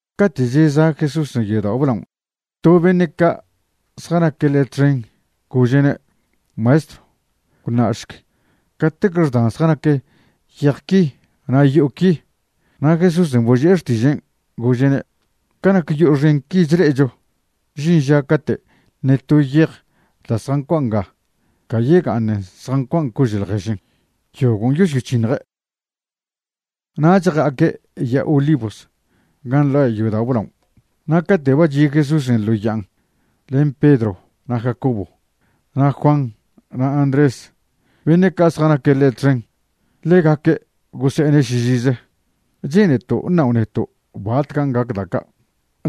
Cate' cheza' Jesúsen' yodao' blaon' to beṉe' ca' zjanaque' ḻe' txen gože'ne': ―¡Maestro, gwṉa'šc catec xdan zjanac yej qui na' yo'o qui! Na' Jesúsen' boži'e xtižen', gože'ne': ―Ca nac yo'o xen qui chle'echo, žin ža cate' ṉe to yej da' zjancua' nga ca yega'aṉ zjancua' cože' ḻježen. Yogon' yosyoc̱hiṉje'. Nach ja'aque' Ya'a Olivos gan' nḻa' yodao' blaon'. Na' cate' ba chi' Jesúsen' ḻo ya'an len Pedro na' Jacobo, na' Juan na' Andrés, beṉe' ca' zjanaque' ḻe' txen, ḻegaque' gose'ene' šižize: ―Che'neto' ṉao' neto' batcan' gac da' ca'.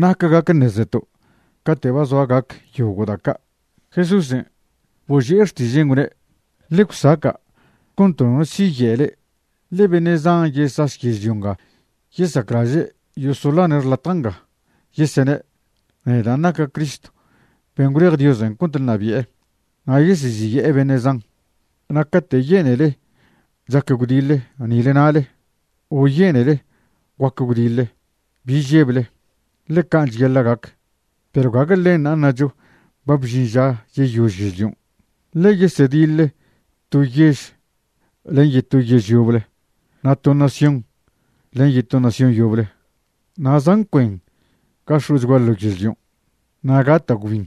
¿Nac gac ṉezeto' cate' ba zoa gac yogo' da' ca'? Jesúsen' boži'e xtižen', gwne': ―Ḻe gwsaca' cont nono siye' le'e. Ḻe beṉe' zan yesaš yežlio nga yesaclaže' yosoḻane' xlatja' nga, yesene': “Nedan' naca' Cristo ben' gwlej Diosen' cont ṉabi'e.” Na' yeseziye'e beṉe' zan. ’Na' cate' yenele chac gwdiḻe nile nale, o yenele guac gwdiḻe, bi žeble, ḻe can' cheyaḻa' gac. Perw gague ḻenṉa' ṉacho ba bžin ža yeyož yežlion'. Ḻe yesediḻ to yež len yeto yež yoble na' to nación len yeto nación yoble, na' zan cuen ga x̱o'chgua ḻo yežlion', na' gata' gwbin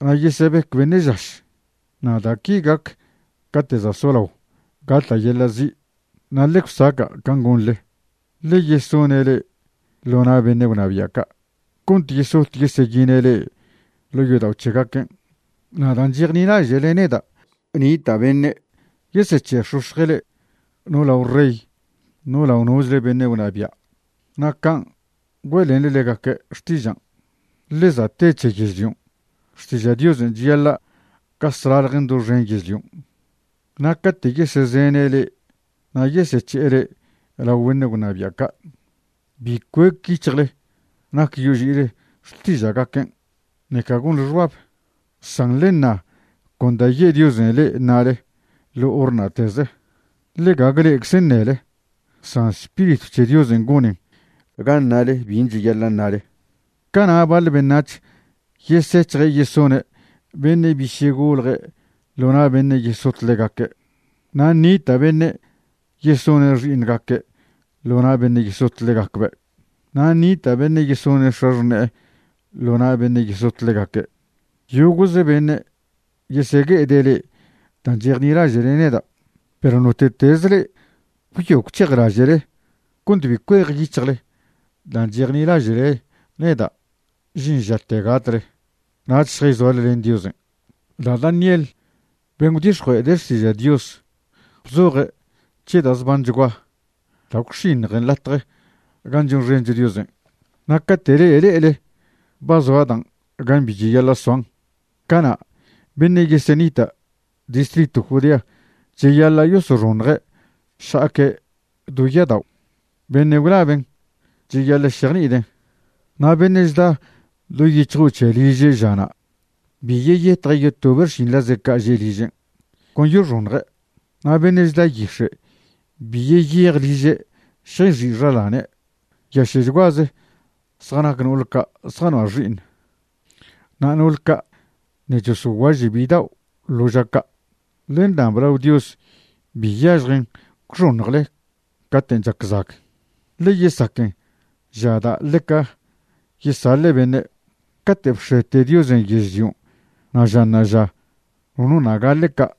na' yesebec beṉe' žaš. Na' da' qui gac cate' za' solao gata' yeḻa' zi'. ’Na' ḻe gwsaca' can' gonḻe, ḻe yesoṉe' le'e ḻo na' beṉe' gwnabia' ca' cont yesot yeseyine' le'e ḻo' yodao' c̱hegaquen', na' dan' chejnilaže'le neda' nita' beṉe' yesec̱he'ex̱ox̱je' le'e no lao rey no lao nochle beṉe' gwnabia', na' can' güe'lenḻe ḻegaque' xtižan'. Ḻe za' te c̱he yežlion', xtiža' Diosen' cheyaḻa' gas ḻaḻjen doxen yežlion'. Na' cate' yesezene' le'e na' yesec̱he'e le'e lao beṉe' gwnabia' ca', bi cuec yic̱hjle nac yoži'ile xtiža'gaquen', ṉeca gonḻen xbab. San ḻe ṉa con da' ye' Diosen' le'e ṉale ḻo hor na'teze, ḻe gague le'eczen' ṉele, san Spiritw c̱he Diosen' goṉen ga ṉale bin' cheyaḻa' ṉale. Cana' baḻ beṉac̱h yesec̱hje' yesone' beṉe' biše' golje' ḻo na' beṉe' yesot ḻegaque', na' nita' beṉe' yesone' xi'iṉgaque' ḻo na' beṉe' yesot ḻegacbe', na' nita' beṉe' yesone x̱axṉe'e ḻo na' beṉe' yesot ḻegaque'. Yogo'ze beṉe' yesegue'ede' le'e dan' chejnilaže'le neda', perw note'tez le'e gwyo gwc̱hejlaže'le cont bi cuejyic̱hjle dan' chejnilaže'le neda' žin žate gatle, nach šjayzoale len Diosen'. ’Da' Daniel ben' gwdix̱jue'ede' xtiza' Dios bzoje' c̱he da' zbanchgua da' gwx̱iṉjen latje gan' chonxencho Diosen'. Na' cate' le'e le'ele ba zoa dan' gan' bi cheyaḻa' soan, cana' beṉe' yesenita' distritw Judea cheyaḻa' yosoxoṉje' šja'aque' do ya'adao'. (Beṉe' gwlaben' cheyaḻa' šejni'iden'.) Na' beṉe' chda do yic̱hjo' c̱he liže' žana', bi yeyetje' yotobe' xšinḻaze' ca' že' ližen', con yoxoṉje'. Na' beṉe' chda yix̱e' bi yeyej liže' šjayxi' xaḻane'. ¡Nyaše'chguaze zjanac no'ol ca' zjanoa' xi'iṉ, na' no'ol ca' ṉe' chosoguaže' bidao' ḻo ža ca'! Ḻe ṉab lao Dios bi yažjen gwxoṉjle caten' chac zag, ḻe yesaquen ža da' ḻeca yesaḻe' beṉe'. Cate' bx̱ete Diosen' yežlio na' ža ṉa'aža nono ṉa' gaḻe' ca',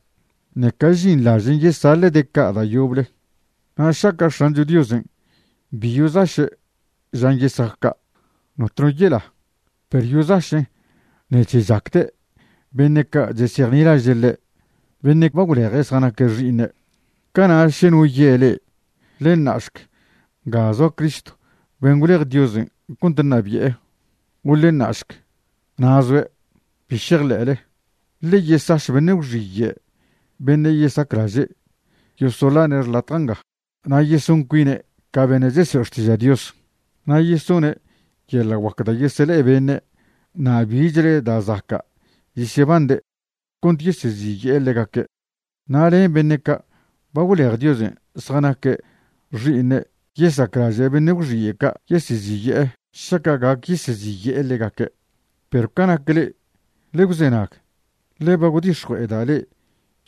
ṉeca žinḻažen' yesaḻe'de' ca' da' yoble. Na' šaca' X̱ancho Diosen' bi yozaše' žan' yesac ca', notno yela, perw yozašen' ṉec̱he chacde' beṉe' ca' chesejnilaže' ḻe', beṉe' ba gwleje' zjanaque' xi'iṉe'. ’Cana' še no ye' le'e: “Ḻe ṉa'šc, nga zoa Cristo ben' gwlej Diosen' cont ṉabi'e”, o “Ḻe ṉa'šc, na' zoe'”, bi šejḻe'le. Ḻe yesaš beṉe' gwxiye' beṉe' yesaclaže' yosoḻane' xlatja' nga, na' yeson cuine' ca beṉe' chesoe' xtiža' Dios. Na' yesone' yeḻa' guac da' yesele'e beṉe' na' bichle da' zaca' yesyebande' cont yeseziye'e ḻegaque', na' len beṉe' ca' ba gwlej Diosen' zjanaque' xi'iṉe' yesaclaže' beṉe' gwxiye' ca' yeseziye'e šaca' gac yeseziye'e ḻegaque'. Perw ca nac le'e, ḻe gwzenag, ḻe ba gwdix̱jue'eda' le'e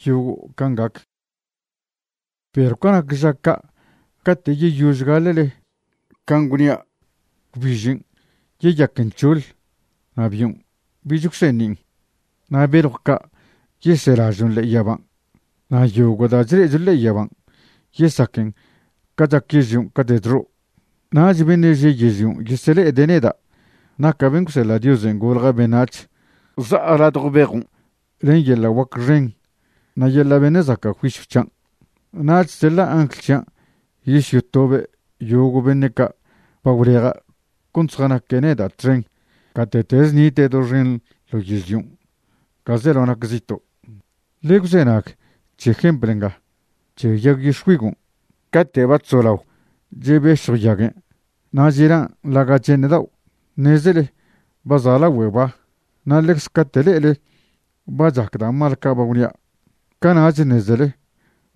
yogo' can' gac. ’Perw ca nac ža ca' cate' yeyož gaḻe'le can' gwnia', gwbižen' yeyaquen c̱hoḻ na' bion' bich gwseṉin'. Na' beljw ca' yeselažon' ḻe'e yaban', na' yogo' da' chle'echo ḻe'e yaban' yesaquen ca chac yežlion' cate' chxo'. Nach beṉe' že' yežlion' yesele'ede' neda' naca' ben' gwseḻa' Diosen' golja' beṉac̱h za'a ladjo bejon' len yeḻa' guac xen na' yeḻa' beṉe' zaca' juisyw c̱hian'. Nach seḻa' angl c̱hian' yosyotobe' yogo' beṉe' ca' ba gwleja' cont zjanaque' neda' txen gate'teze nite' doxen ḻo yežlion', ga zelao nac zito'. ’Ḻe gwzenag c̱he jempl nga c̱he yag yix̱güigon': Cate' ba chzolao chebešjw yaguen' na' chelan' ḻaga' che'eṉ dao', ṉezele ba za' lagüe ba. Na' ḻecze cate' le'ele ba chac da' mal ca' ba gwnia', cana'ch ṉezele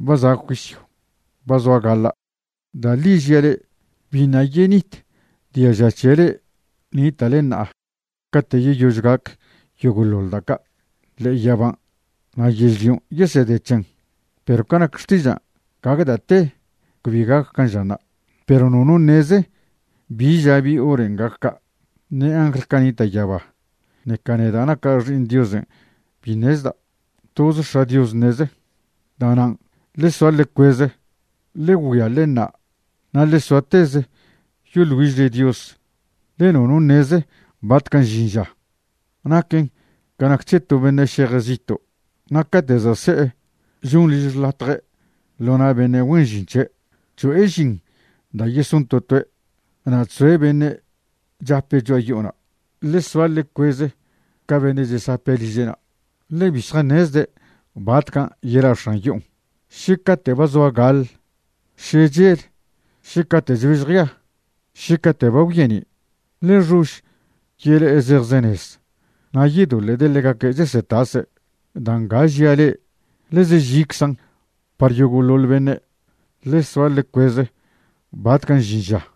ba za' juisyw, ba zoa gaḻa'. Da' ḻi žia' le'e, biṉa' yenit diaža c̱he le'e nita'le ṉa'a cate' yeyož gac yogo'ḻoḻ da' ca'. Ḻe'e yaban' na' yežlion' yesede c̱hen, perw ca nac xtižan', gague da' te cbi gac can' žanṉa'. ’Perw nono ṉeze bi ža bi horen' gac ca', ṉe angl ca' nita' yaba, ṉeca neda' naca' Xi'iṉ Diosen' bi ṉezda'. Toze X̱a' Dios ṉeze. ’Da'nan', ḻe soa ḻe cueze, ḻe güia ḻe ṉa', na' ḻe soateze yoḻ güižle Dios, ḻe nono ṉeze batcan' žin ža. Naquen ca nac c̱he to beṉe' šeje' zito', na' cate' za' se'e choṉ liž xḻatje' ḻo na' beṉe' güen žin c̱he', cho'e žin da' yeson to toe', na' chzoe' beṉe' chape' cho'a yo'ona'. Ḻe soa ḻe cueze ca beṉe' chesape' liže'na', ḻe bi zjaṉezde' batcan' yela' x̱an yo'on, še cate' ba zoa gaḻ, še chel, še cate' chbež jea, še cate' ba gwyeni'. Ḻe xož yele'e zejzenez na' yedoḻe'de' ḻegaque' chesetase'. Da' nga žia' le'e ḻeze žiczan' par yogo'ḻoḻ beṉe'. Ḻe soa ḻe cuez batcan' žin ža.